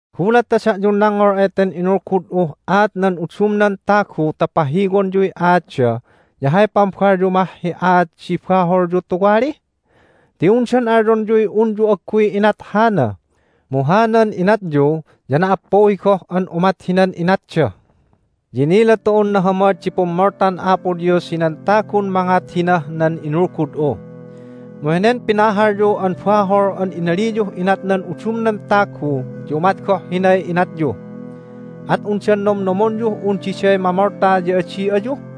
Gulat ta da'yun nangngol eten inulgud'uh aat nan udumnan tagu ta pahiwonyuy aatda ya hay pambalyu mah hi aat di baholyu tuwali? Ti undan alyonyuy unyu agguy inat hana, mu hanan inatyu ya na"appuhi goh an umat hinan inatda! Ya inila tu'un nahamad di pummoltan Apo Dios hinan tagun mangat hinah nan inulgud'u. Mu henen pinahalyu an bahol an inaliyuh inat nan udumnan tagu ya umat goh hinay inatyu! At undan nomnomonyuh un diday mamolta, ya adi ayu?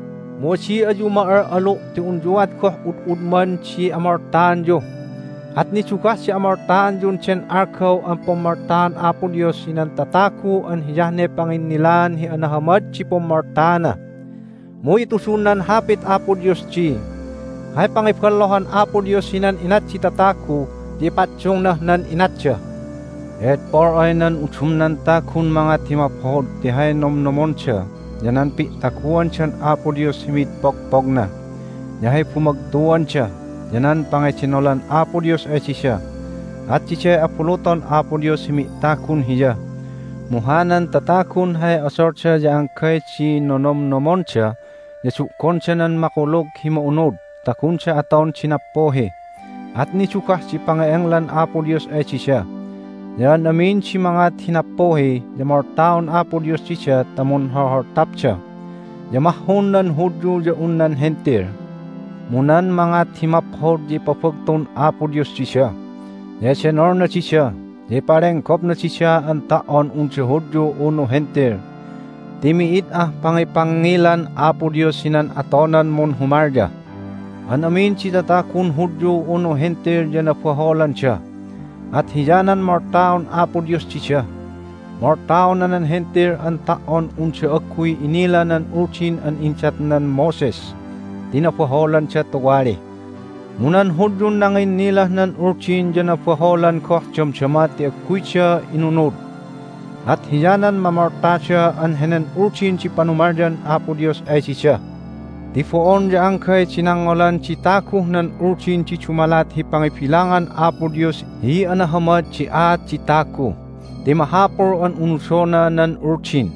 Mu adi ayu ma'al'alu', ti unyuat goh ud'udman di amoltaanyu, at nidugah di amoltaanyun den algaw an pummoltaan Apo Dios hinan tatagu an hiyah ne panginnilaan hi anahamad di pummoltaana. Mu itudun nan Hapit Apo Dios di, "Hay pangiballohan Apo Dios hinan inat di tatagu ya ipaddungnah nan inatda." Ti edpol ay nan udumnan tagun mangat hi maphod ti hay nomnomonda ya nan pi'taguandan Apo Dios hi mid pogpogna, ya hay bumagtuanda, ya nan pangedenolan Apo Dios ay dida, at diday abuluton Apo Dios hi mi'tagun Hiya. Mu hanan tatagun hay odolda ya anggay di nonomnomonda, ya du'gonda nan Makulug hi Ma'unud ta gunda aton di nappuhi, at nidugah di pange'englan Apo Dios ay dida. Ya an amin di mangat hi nappuhi ya moltaon Apo Dios dida ta munholholtapda, ya mahhun nan Hudyu ya un nan Hentil. Mu nan mangat hi maphod ya ipabagtun Apo Dios dida, ya edenolna dida, ya ipalenggopna dida an ta"on unda Hudyu unu Hentil. Ti mi'id ah pangipangngilan Apo Dios hinan atonan munhumalya. An amin di tatagun Hudyu unu Hentil ya nabaholanda, at hiyanan moltaon Apo Dios dida. Moltaona nan Hentil an ta"on hi unda agguy inila nan Uldin an indatnan Moses ti nabaholanda tuwali. Mu nan Hudyun nanginnilah nan Uldin ya nabaholan goh damdama ti agguyda inunud, at hiyanan mamoltada an henen Uldin di panumalyan Apo Dios ay dida. Ti bo'on ya anggay di nangngolan di taguh nan Uldin di dumalat hi pangibilangan Apo Dios hi anahamad di aat di tagu, ti mahapul an unudona nan Uldin.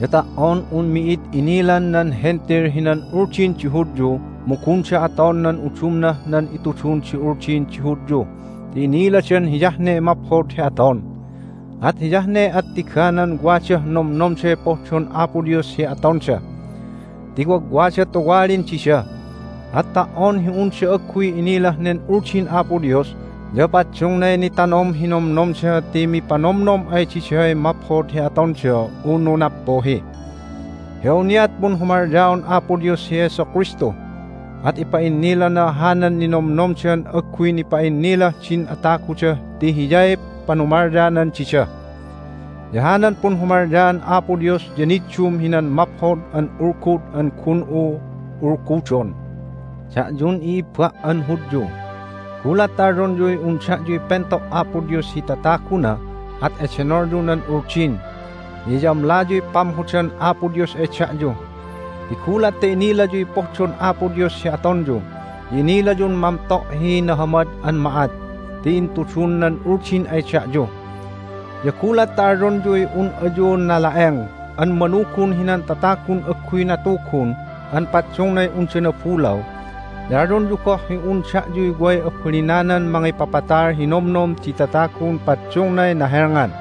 Ya ta"on un mi'id inilan nan Hentil hinan Uldin di Hudyu mu gunda aton nan udumnah nan itudun di Uldin di Hudyu ti iniladan hiyah ne maphod hi aton. At hiyah ne attiganan wadah nomnomday pohdon Apo Dios hi atonda ti wagwagda tuwalin dida. At ta"on hi unda agguy inilah nen Uldin Apo Dios ya paddungnay nitanom hi nomnomda ti mipanomnom ay diday maphod hi atonda unu nappuhi. Hi awniat punhumalyaon Apo Dios hi Jesu Kristu, at ipa'innilana hanan ninomnomdan agguy nipa'innilah din ataguda ti Hiyay panumalyanan dida, ya hanan punhumalyaan Apo Dios ya niddum hinan Maphod an Ulgud an gun'u ulgudon. Da'yun i'ibba' an Hudyu, gulat ta alyonyuy un da'yuy pento' Apo Dios hi tataguna at edenolyu nan Uldin, ya iyamlayuy pamhodan Apo Dios ay da'yu. Ti gulat ta inilayuy pohdon Apo Dios hi atonyu, ya inilayun mamto' hi nahamad an ma'at ti intudun nan Uldin ay da'yu, ya gulat ta alyonyuy un ayu nala'eng an manugun hinan tatagun agguy natugun an paddungnay unda nabulaw, ya alyonyu goh hi un da'yuy way abalinanan mangipapatal hi nomnom di tatagun paddungnay nahelngan,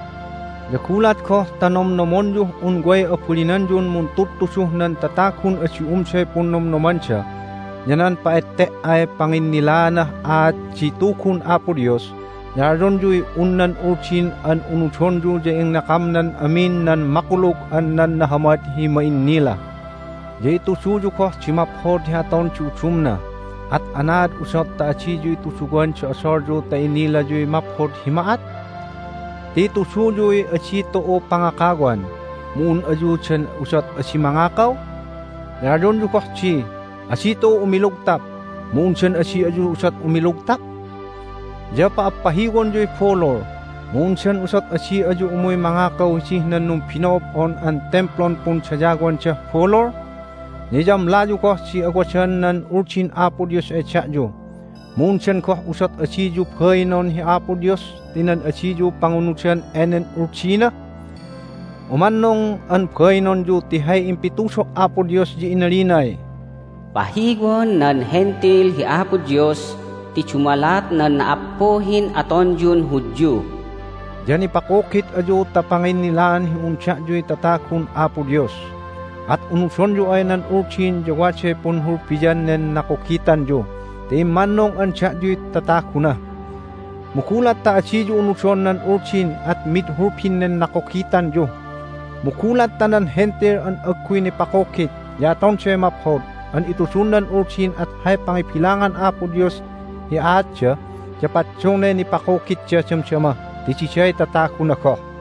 ya gulat goh ta nomnomonyuh un way abalinanyun muntudtuduh nan tatagun adi umday punnomnomanda, ya nan pa'ette"ay panginnilaanah aat di Tugun Apo Dios, ya alyonyuy un nan Uldin an unudonyu ya inakamnan amin nan makulug an nan nahamad hi ma'innila, ya ituduyu goh di maphod hi aton di udumna. At anaad udot ta adiyu ituduwan di odolyu ta inilayuy maphod hi ma'at? Ti ituduyuy, "Adi tu'u pangakawan!" mu un ayu dan udot adi mangakaw? Ya alyonyu goh di, "Adi tu'u umilugtap!" mu undan adi ayu udot umilugtap? Ya pa'appahiwonyuy bulul, mu undan udot adi ayu umuy mangakaw hidih nan numbino'ob'on an timplun pundayawandah bulul? Ya iyamlayu goh di awadan nan Uldin Apo Dios ay da'yu, mu undan goh udot adiyu bainon hi Apo Dios ti nan adiyu pangunudan enen Uldina? Umannung an bainonyu ti hay impitudo' Apo Dios ya inalinay, "Pahiwon nan Hentil hi Apo Dios ti dumalat nan na"appuhin atonyun Hudyu." Ya nipakugit ayu ta panginnilaan hi un da'yuy tatagun Apo Dios, at unudonyu ay nan Uldin ya waday punhulbian nen nakugitanyu ti immannung an da'yuy tataguna. Mu gulat ta adiyu unudon nan Uldin at mid hulbin nen nakugitanyu! Mu gulat ta nan Hentil an agguy nipakugit ya atonday maphod an itudun nan Uldin at hay pangibilangan Apo Dios hi aatda ya paddungnay nipakugitda damdama ti diday tataguna goh.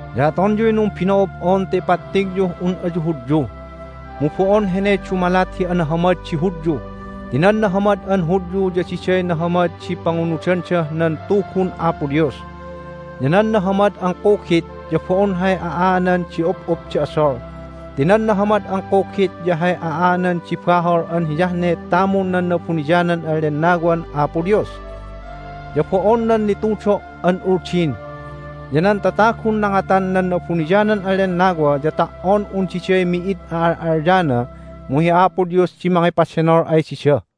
Ya atonyuy numbino'ob'on ta ipattigyuh un ayu Hudyu, mu bo'on heney dumalat hi anahamad di Hudyu. Ti nan nahamad an Hudyu ya diday nahamad di pangunudandah nan Tugun Apo Dios. Ya nan nahamad an kugit ya bo'on hay a'aanan di up'up di odol, ti nan nahamad an kugit ya hay a'aanan di bahol an hiyah ne tamun nan Na'abuniyanan an Lennawan Apo Dios, ya bo'on nan nitudo' an Uldin. Ya nan tatagun nangatan nan Na'abuniyanan an Lennawa ya ta"on un diday mi'id a'al'alyana mu hi Apo Dios di mangipadenol ay dida.